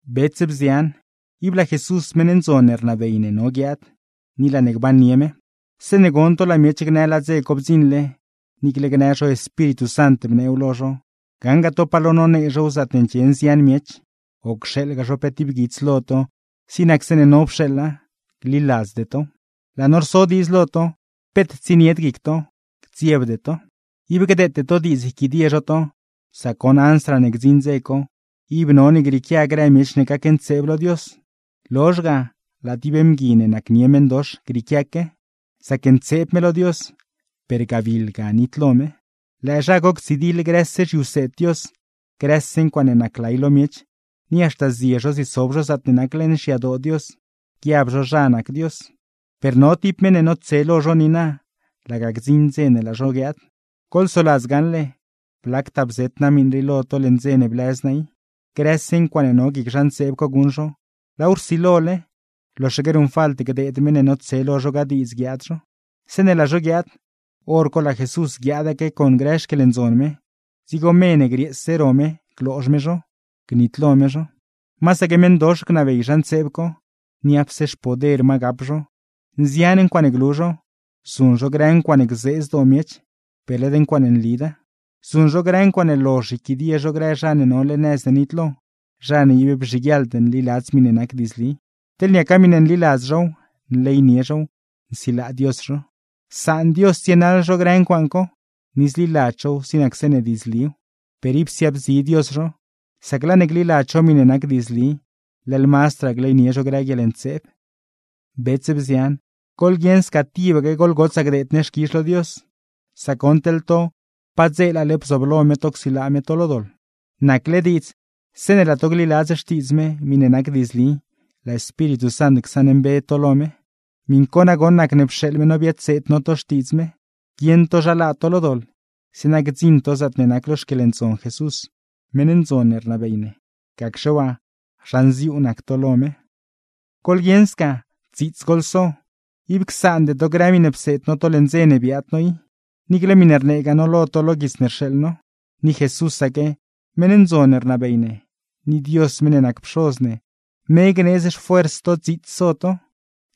Bets, bzian, ib laa Jesús meṉ ndzon ne rnabey ne no guiaad, ni laa ne gbannie me. Zeeṉe gon to laa miech gnë laa dze co bdziṉle, niicle gnë zho Espíritu Sant bneew lo zho, gaṉgaa to palo nonee zhow zaatne ndxie nzian miech, o cxeeḻgaa zho pe tib guits lo to zig nac zeeṉe no pxeeḻa; gliladzde tow. Laa no rso diidz lo to, peet tsienied guic to, gdziebde to. Ib gdeete to diidz yquidie zho to. Sac goṉ ansraa ne gdziṉ dze co, ib none grieequia grë miech ne gacntseeb lo Dios; lozh ga, laa tib mgui ne nacnie meṉdox grieequiaque, zacntseeb me lo Dios, per gabiḻ ga nitlo me. Lëë zha co ctsidiḻ grëse zhiwseed Dios, grëse ncuaaṉe naclay lo miech; ni haxta zie zho ziesob zho zaatne nac leṉ xyadoo Dios, guiab zho zha nac Dios. Per no tib meṉ ne notse lo zho niina, laga gdziṉ dze ne laa zho guiaad. Goḻsoladz gaṉle, blactaa bzeet naa miṉ rii lo to leṉ dze ne blëz naa i. Grëse ncuaaṉe no guic zha ntseeb co guṉ zho, laaw rsilole; loxaque ruṉfalt gdeed meṉ ne notse lo zho ga diidz guiaad zho. Zeeṉe laa zho guiaad, hor co laa Jesús guiaadaque con grë xquieḻndzon me, dzigo me ne grieese ro me gloozh me zho, gnitlo me zho. Masaque meṉdox gnabey zha ntseeb co, niapse xpoder ma gap zho, nzian ncuaaṉe glu zho; zuṉ zho grë ncuaaṉe gzee zdoo miech, per led ncuaaṉe nlida. Zuṉ zho grë ncuaaṉe lozh yquidie zho grë zha ne nole nëz ne nitlo, zha ne ib bzhiguieḻd nliladz miṉe nac diidzli. Teḻ niaca miṉe nliladz zhow, nleynie zhow, nsilaa Dios zho. Saan Dios tsienaḻ zho grë ncuaaṉ co, ni zliladz zhow zig nac zeeṉe diidzliw; per ib siaabzi Dios zho, sac laa ne gliladz zho miṉe nac diidzli, leḻ mazdraa gleynie zho grë guieḻntseeb. Bets, bzian, goḻguieṉ sca tibaque goḻgotsaa gdeed ne xquizh lo Dios; sac goṉ teḻ to padzeelale bzooblo me to csilaa me to lo doḻ. Nacle diidz zeeṉe laa to gliladz Xtiidz me, miṉe nac diidzli, laa Espíritu Sant csaṉmbe to lo me. Miṉ co nagoṉ nacne pxeeḻ me no biadseed no to xtiidz me, guieṉ to zha laa to lo doḻ; zeeṉa gdziṉ to zaatne nac lo xquieḻndzon Jesús, meṉ ndzon ne rnabey ne. Gacxe waa, zha nziuu nac to lo me. Goḻguieṉ sca, dziits goḻso, ib csaande to grë miṉe pseed no to leṉ dze ne biaad no i, niicle miṉe rneegaa no lo to lo guits ne rxeeḻ no. Ni Jesúsaque, meṉ ndzon ne rnabey ne, ni Dios meṉ ne nac Pxoz ne, me gneedz xfuers to dziits so to;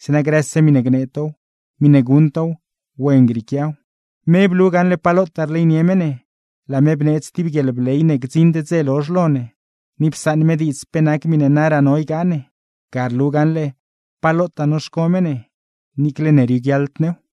zeeṉa grëse miṉe gnee tow, miṉe guṉ tow, wen grieequiaw. Me blu gaṉle pa lotaa rleynie me ne, laa me bneedz tib guieḻbley ne gdziṉd dze lozh lo ne, ni psaṉ me diidz pe nac miṉe naraa no ygaa ne. Ga rlu gaṉle pa lotaa noxco me ne, niicle ne rioguiaḻd new.